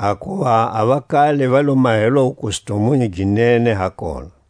Hakuva a vakale va lo mahelwa a wukustumunyu gi nene ha kona.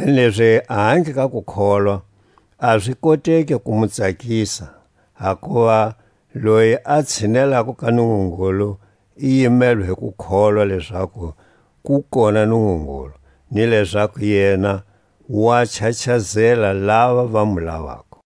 Kanilezi ahandle ka kukholwa a zi koteki ku mu tsakisa; hakuva loyi a tshinelako ka Nungungulu i yimelwe hi ku kholwa lezaku ku kona Nungungulu, ni lezaku yena wa chachazela lava va mu lavako.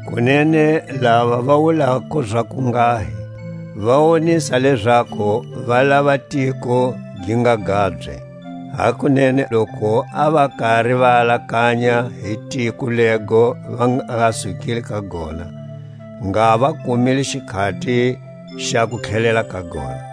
Kunene lava va wulako zakunghahi va wonisa lezaku va lava a tiko gi nga gabye. Hakunene loku a va kari va alakanya hi tiko lego va nga sukile ka gona, ngha va kumile xikhati xa ku tlhelela ka gona.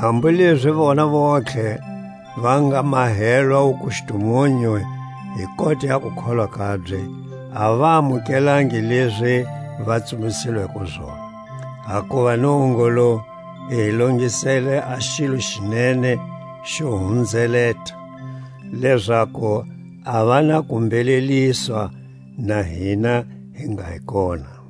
Hambu lezi vona vontlhe va nga mahelwa wukustumunyu hi kota ya kukholwa kabye, a va amukelangi lezi va tsumbisilweko zona, hakuva Nungungulu i hi longiselele a xilo xi nene xe hunzeleta, lezaku a va na ku mbheleliswa na hina hi nga hi kona.